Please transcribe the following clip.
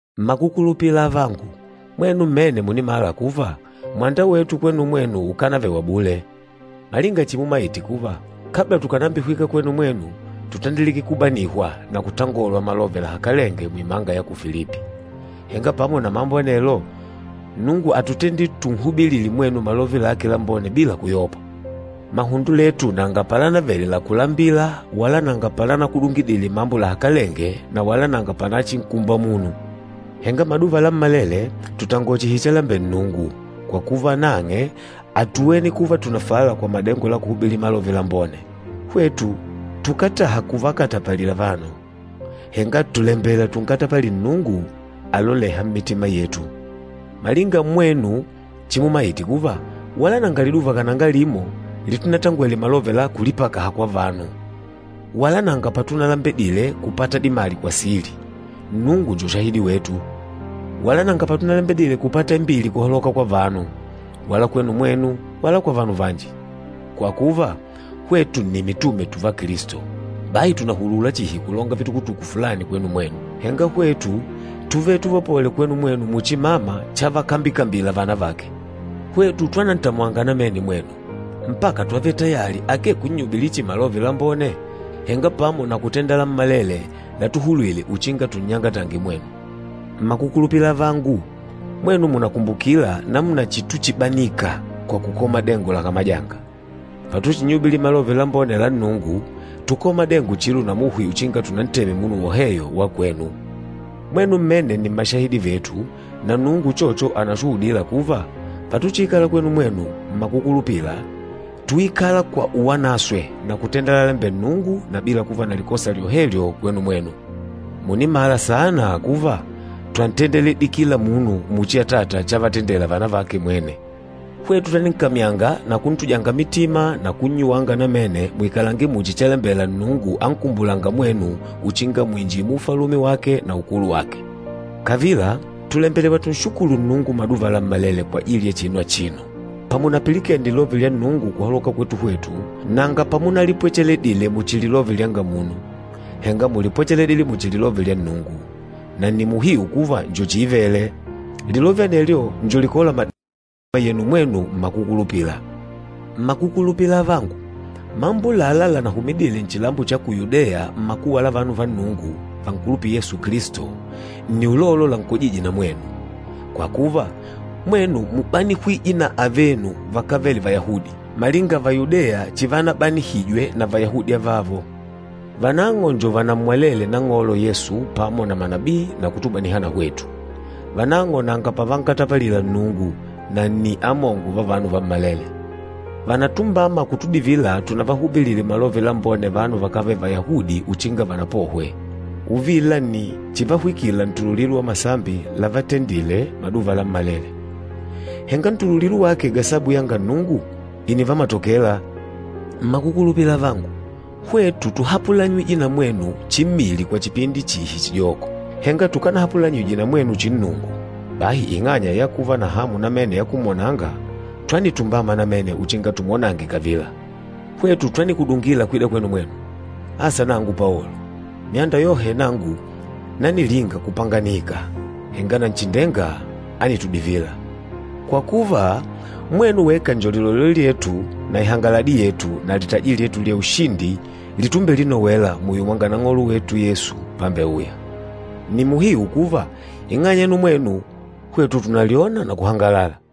Mmakukulupila avangu, mwenu mmene mùnimala kuva, mwanda wetu kwenu mwenu ukánavele wa bule. Malinga chimumaite kuva, kabla tukànambihwika kwenu mwenu, tútandilike kubanihwa na kutangolwa malove lahakalenge muimanga ya ku Filipi. Henga pamo na mambo anelo, Nnungu átutendile tunnyubilile mwenu Malove lake Lambone bila kuyopa. Mahundo letu nanga palanavele la kulambila wala nanga palanakudungidile mambo lahakalenge na wala nanga palachinkumba munu. Henga maduva lammalele tùtangola chihi chalambela Nnungu, kwa kuva nang'e átuwene kuva tùnafala kwa madengo la kuhubili Malove Lambone. Hwetu tukátaha kuvakatapalila vanu, henga tùlembela tunkatapalile Nnungu alolêha mmitima yetu. Malinga mwenu chimumaite kuva, wala nanga liduva kananga limo litunatangwele malove la kulipakaha kwa vanu wala nanga patunalembedile kupata dimali kwa sili, Nnungu njo shahidi wetu. Wala nanga patunalembedile kupata imbili kuhaloka kwa vanu, wala kwenu mwenu, wala kwa vanu vanji. Kwa kuva, hwetu nni mitume tùvá Kilisto, bahi tùnahulula chihi kulonga vitukutuku fulani kwenu mwenu. Henga hwetu túvele tuvapole kwenu mwenu muchi mama chavakambikambila vana vake. Hwetu twanantamwanga namene mwenu, mpaka twávele tayali akee kunnyubilila chihi Malove Lambone, henga pamo na kutenda lammalele latuhulwile uchinga tunnyangatange mwenu. Mmakukulupila avangu, mwenu mùnakumbukila namuna chituchibanika kwa kukola madengo lakamajanga. Patuchinnyubilila Malove Lambone la Nnungu, túkola madengo chilo na muhi uchinga tunanteme munu woheyo wa kwenu. Mwenu mmene nni mmashahidi vetu, na Nnungu uchocho ànashuhudila kuva, patuchiikala kwenu mwenu mmakukulupila, túikala kwa uwanaswe na kutenda lalalembela Nnungu na bila kuva na likosa lyohevyo kwenu mwenu. Mùnimala saana kuva, twantendeledile kila munu muchi atata chavatendela vana vake mwene. Hwetu twaninkamyanga na kuntujanga mitima na kunnyuwanga namene muikalange muchi chalembela Nnungu ankumbulânga mwenu uchinga muinjile mu Ufalume wake na ukulu wake. Kavila, tùlembelewa tùnshukulu Nnungu maduva lammalele kwajili ya chinu achino, pamunapilikene lilove lya Nnungu kuhaloka kwetu hwetu, nanga pamunalipwecheledile muchi lilove lyanga munu, henga múlipwecheledile muchi lilove lya Nnungu, na nni muhiu kuva njo chiivele. Lilove anelyo njo likôla madengo mmitima yenu mwenu mmakukulupila. Mmakukulupila avangu, mambo ulâla lanahumidile nchilambo cha ku Yudeya mmakuwa la vanu va Nnungu vankulupîla Yesu Kilisto, nni ulolo lankojîje na mwenu. Kwa kuva, mwenu múbanihwije na avenu vakávele Vayahudi, malinga Vayudeya chivanabanihwije na Vayahudi avavo. Vanang'o nni vanammwalele Nang'olo Yesu pamo na manabii na kutubaniha na hwetu. Vanang'o nanga pavankatapalila Nnungu, na nni amongo va vanu vammalele! Vànatumbama kutudivila tunavahubilile Malove Lambone vanu vakávele Vayahudi uchinga vanapohwe. Uvila nni chivahwikila ntululilo wa masambi lávatendìlè maduva lammalele. Henga ntululilo wake gasabu yanga Nnungu ìnivamatokela. Mmakukulupila avangu, hwetu túhapulanyijwe na mwenu chimmili kwa chipindi chihi chijoko, henga tukanahapulanyijwe na mwenu chinnungu. Bahi ing'anya ya kuva na hamu namene ya kumwonanga, twanitumbama namene uchinga tumwonange kavila! Hwetu twanikudungila kwida kwenu mwenu, asa nangu Paolo. Myanda yohe nangu nanilinga kupanganika, henga Nanchindenga ánitudivila. Kwa kuva, mwenu weka njo lilolelo lyetu na ihangaladi yetu na litaji lyetu lya ushindi itumbelinowela muyo mwa Nang'olo wetu Yesu, pambeuya. Nni muhiu kuva, ing'anya yenu mwenu, hwetu tùnalyona na kuhangalala.